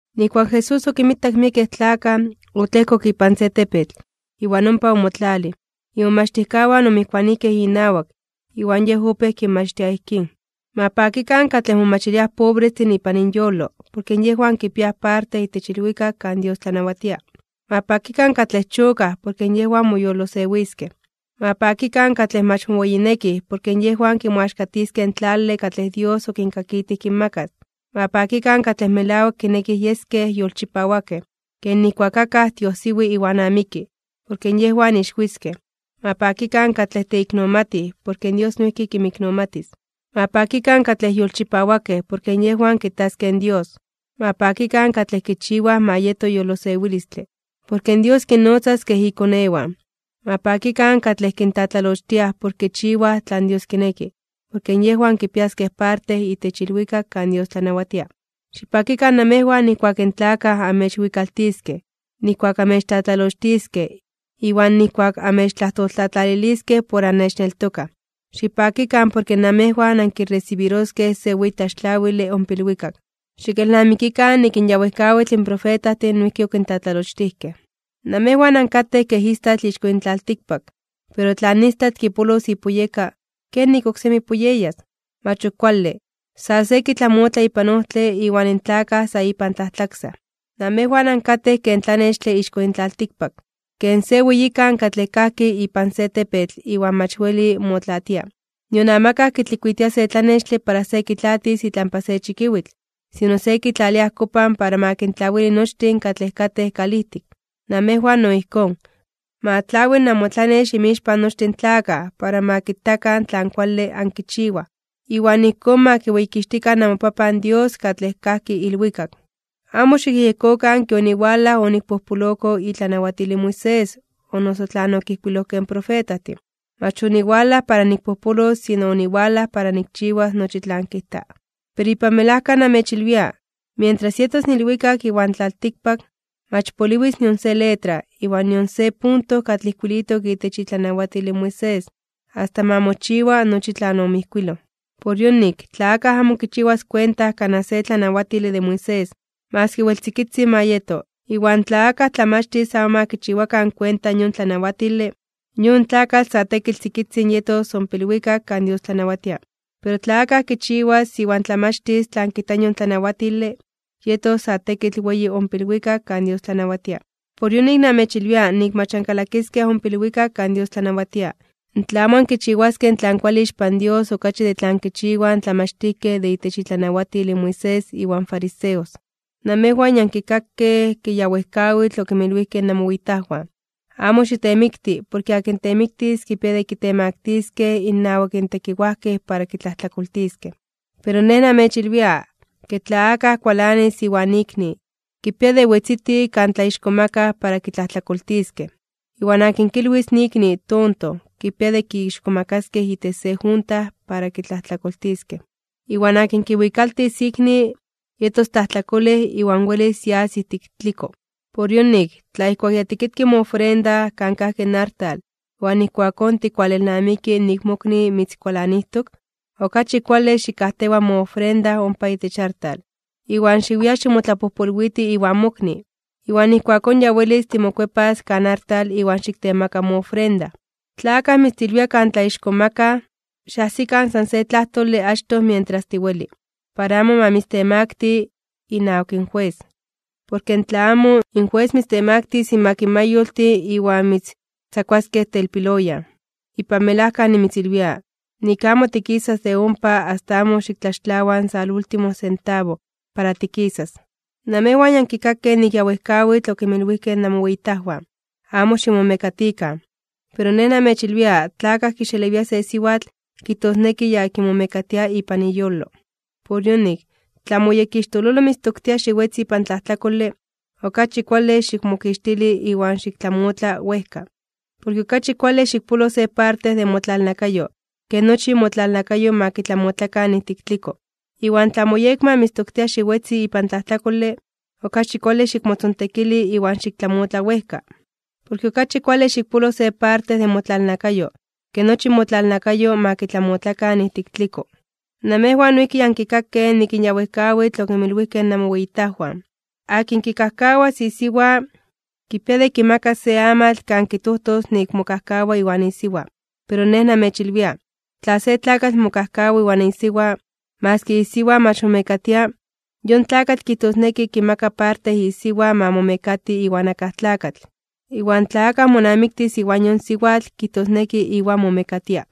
Nijkuak in Jesús okinmitak miekej tlakaj, otlejkok ipan se tepetl, iwan ompa omotlalij. Imomachtijkawan omijkuanijkej inawak. Iwan Yej opéj kinmachtia ijkín: ―Ma pakikan katlej momachiliaj pobrestin ipan inyolo, porke yejwan kipiaj parte itech ilwikak kan Dios tlanawatia. ’Ma pakikan katlej chokaj, porke yejwan moyolosewiskej. ’Ma pakikan katlej mach moweyinekij, porke yejwan kimoaxkatiskej in tlale katlej Dios okinkakitij kinmakas. ’Ma pakikan katlej melawak kinekij yeskej yolchipawakej, ken nijkuak akaj tiojsiwi iwan amiki. Porke yejwan ixwiskej. ’Ma pakikan katlej teiknomatij, porke Dios noijki kinmiknomatis. ’Ma pakikan katlej yolchipawakej, porke yejwan kitaskej in Dios. ’Ma pakikan katlej kichiwaj ma yeto yolosewilistle, porke Dios kinnotzas kej ikonewan. ’Ma pakikan katlej kintlatlalochtiaj por kichiwaj tlan Dios kineki, porke yejwan kipiaskej parte itech ilwikak kan Dios tlanawatia. ’Xipakikan namejwan nijkuak in tlakaj amechwikaltiskej, nijkuak amechtlatlalochtiskej, iwan nijkuak amechtlajtoltlatlaliliskej por annechneltokaj. Xipakikan, porke namejwan ankiresibiroskej se weyi tlaxtlawile ompa ilwikak. Xikelnamikikan nik in ya wejkawitl profetajtin noijki okintlatlalochtijkej. ’Namejwan ankatej ken istatl ixko yin tlaltikpak. Pero tla in istatl kipolos ipuyeka, ¿kenik oksemi puyeyas? Mach ok kuale, sa se kitlamotla ipan ojtle iwan in tlakaj sa ipan tlajtlaksaj. ’Namejwan ankatej ken tlanextle ixko yin tlaltikpak, ken se weyikan katlej kajki ipan se tepetl iwan mach weli motlaatia. Nion amakaj kitlikuitia se tlanextle para se kitlaatis itlampa se chikiwitl. Sino se kitlalia ajkopan para ma kintlawili nochtin katlej katej kalijtik. Namejwan no ijkón, ma tlawi namotlanex inmixpan nochtin in tlakaj, para ma kitakan tlan kuale ankichiwaj, iwan ijkón ma kiweyikixtikan namoPapan Dios katlej kajki ilwikak. ’Amo xikyejyekokan ke oniwalaj onikpojpoloko itlanawatil in Moisés o noso tlan okijkuilojkej in profetajtin. Mach oniwalaj para nikpojpolos, sino oniwalaj para nikchiwas nochi tlan kijta. Pero ipan melajka namechilwia, mientras yetos in ilwikak iwan tlaltikpak, mach poliwis nion se letra, iwan nion se punto katlej ijkuilitok itech itlanawatil in Moisés, asta ma mochiwa nochi tlan omijkuiloj. Por yonik, tla akaj amo kichiwas kuenta kanaj se tlanawatile de Moisés, maski wel tzikitzin ma yeto, iwan tla akaj tlamachtis amo ma kichiwakan kuenta in yon tlanawatile, yon tlakatl sa tekitl tzikitzin yetos ompa ilwikak kan Dios tlanawatia. Pero tla akaj kichiwas iwan tlamachtis tlan kijta in yon tlanawatile, yetos sa tekitl weyi ompa ilwikak kan Dios tlanawatia. Por yonik namechilwia nik mach ankalakiskej ompa ilwikak kan Dios tlanawatia, in tla amo ankichiwaskej tlan kuale ixpan Dios okachi ke tlan kichiwaj in tlamachtijkej de itech itlanawatil in Moisés iwan fariseos. ’Namejwan ya ankikakej ke ya wejkawitl okinmilwijkej namoweyitajwan: “Amo xitemikti, porke akin temiktis kipia de kitemaktiskej (kitemaktiliskej) innawak tekiwajkej para kitlajtlakoltiskej.” Pero Nej namechilwia, ke tla akaj kualanis inawak ikni, kipia de wetziti kan tlaixkomakaj (tlatzonmanaj) para kitlajtlakoltiskej. Iwan akin kilwis in ikni tonto, kipia de kixkomakaskej itech se junta para kitlajtlakoltiskej. Iwan akin kiwikaltis in ikni, yetos tlajtlakolej iwan welis yas ijtik tliko. ’Por yonik, tla ijkuak ya tikitki moofrenda kan kajki in artal iwan ijkuakón tikwalelnamiki nik in mokni mitzkualanijtok, okachi kuale xikajtewa moofrenda ompa itech artal, iwan xiwia ximotlapojpolwiti iwan mokni. Iwan ijkuakón ya welis timokuepas kan artal iwan xiktemaka moofrenda. ’Tla akaj mitztilwia kan tlaixkomakaj (tlatzonmanaj), xajsikan san se tlajtole achtoj mientras tiweli, para amo ma mitztemakti (mitztemaktili) inawak in jues. Porke in tla amo, in jues mitztemaktis inmak in mayoltin iwan mitztzakuaskej telpiloyan. Ipan melajka nimitzilwia, nik amo tikisas de ompa asta amo xiktlaxtlawa in salúltimo sentabo para tikisas. ’Namejwan ya ankikakej nik ya wejkawitl okinmilwijkej namoweyitajwan: “Amo ximomekatikan.” Pero Nej namechilwia, tla akaj kixelewia se siwatl, kijtosneki ya kimomekatia ipan iyolo. ’Por yonik, tla moyekixtololo mitztoktia xiwetzi ipan tlajtlakole, okachi kuale xikmokixtili iwan xiktlamotla wejka. Porke okachi kuale xikpolo se parte de motlalnakayo, ke nochi motlalnakayo ma kitlamotlakan ijtik tliko. Iwan tla moyekma mitztoktia xiwetzi ipan tlajtlakole, okachi kuale xikmotzontekili iwan xiktlamotla wejka. Porke okachi kuale xikpolo se parte de motlalnakayo, ke nochi motlalnakayo ma kitlamotlakan ijtik tliko. ’Namejwan noijki ya ankikakej nik ya wejkawitl okinmilwijkej namoweyitajwan: “Akin kikajkawas isiwa, kipia de kimakas se amatl kan kijtojtos nik mokajkawa iwan isiwa.” Pero Nej namechilwia, tla se tlakatl mokajkawa iwan isiwa, maski isiwa mach momekatia, yon tlakatl kijtosneki kimaka parte isiwa ma momekati iwan akaj tlakatl. Iwan tla akaj monamiktis iwan yon siwatl, kijtosneki iwan momekatia.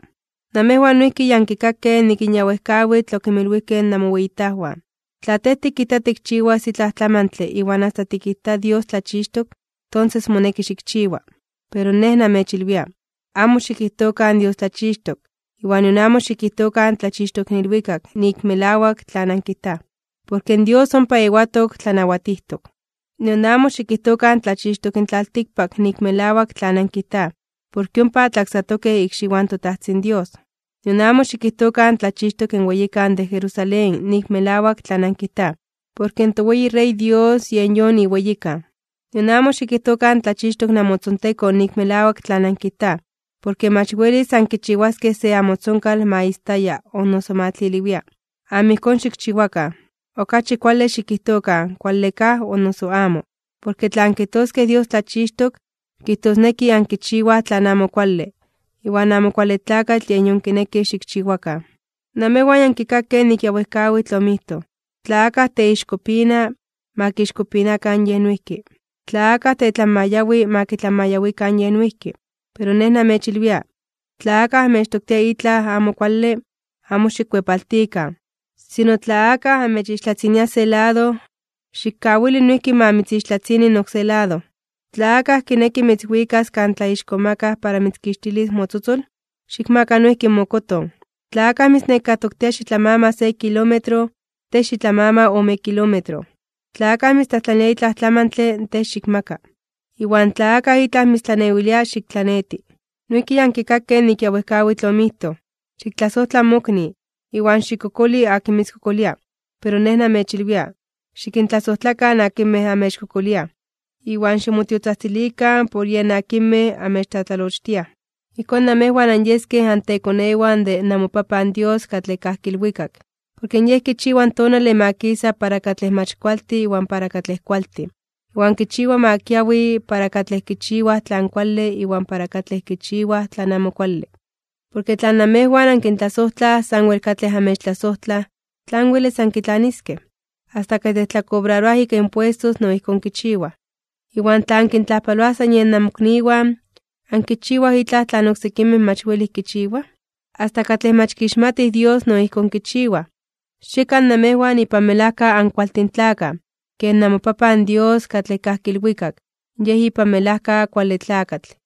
’Namejwan noijki ya ankikakej nik ya wejkawitl okinmilwijkej namoweyitajwan: “Tla tej tikijta tikchiwas itlaj tlamantle iwan asta tikijta Dios tlachixtok, tonses moneki xikchiwa.” Pero Nej namechilwia, amo xikijtokan Dios tlachixtok, iwan nion amo xikijtokan tlachixtok in ilwikak nik melawak tlan ankijtaj, porke in Dios ompa ewatok tlanawatijtok. Nion amo xikijtokan tlachixtok in tlaltikpak nik melawak tlan ankijtaj, porke ompa tlaksatokej ikxiwan in toTajtzin Dios. Nion amo xikijtokan tlachixtok in weyikan de Jerusalén nik melawak tlan ankijtaj, porke in toweyi Rey Dios yen yon iweyikan. Nion amo xikijtokan tlachixtok namotzontekon nik melawak tlan ankijtaj, porke mach welis ankichiwaskej se amotzonkal ma istaya o noso ma tliliwia. Amo ijkón xikchiwakan. Okachi kuale xikijtokan “kuale kaj” o noso “amo”, porke tla ankijtoskej Dios tlachixtok, kijtosneki ankichiwaj tlan amo kuale, iwan Amo Kuale Tlakatl yen yon kineki xikchiwakan. ’Namejwan ya ankikakej nik ya wejkawitl omijtoj: “Tla akaj teixkopina, ma kixkopinakan yej noijki. Tla akaj tetlanmayawi, ma kitlanmayawikan yej noijki.” Pero Nej namechilwia, tla akaj anmechtoktia itlaj amo kuale, amo xikkuepaltikan. Sino, tla akaj amechixtlatzinia se lado, xikkawili noijki ma mitzixtlatzini in oksé lado. Tla akaj kineki mitzwikas kan tlaixkomakaj (tlatzonmanaj) para mitzkixtilis motzotzol, xikmaka noijki mokoton. Tla akaj mitznekatoktia xitlamama se kilómetro, tej xitlamama ome kilómetro. Tla akaj mitztlajtlanilia itlaj tlamantle, tej xikmaka. Iwan tla akaj itlaj mitztlanewilia, xiktlaneti. ’Noijki ya ankikakej nik ya wejkawitl omijtoj: “Xiktlasojtla mokni, iwan xikkokoli akin mitzkokolia.” Pero Nej namechilwia, xikintlasojtlakan akinmej amechkokoliaj, iwan ximotiotzajtzilikan por yen akinmej amechtlatlalochtiaj. Ijkón namejwan anyeskej antekonewan de namoPapan Dios katlej kajki ilwikak. Porke Yej kichiwa in tonale ma kisa para katlej mach kualtin iwan para katlej kualtin, iwan kichiwa ma kiawi para katlej kichiwaj tlan kuale iwan para katlej kichiwaj tlan amo kuale. Porke in tla namejwan ankintlasojtlaj sanwel katlej amechtlasojtlaj, ¿tlan welis ankitlaniskej? Asta katlej tlakobraroaj ika impuestos no ijkón kichiwaj. Iwan tla ankintlajpaloaj san yen namokniwan, ¿ankichiwaj itlaj tlan oksekimej mach welij kichiwaj? Asta katlej mach kixmatij Dios no ijkón kichiwaj. Xiekan namejwan ipan melajka ankualtin tlakaj, ken namoPapan Dios katlej kajki ilwikak Yej ipan melajka kuale tlakatl.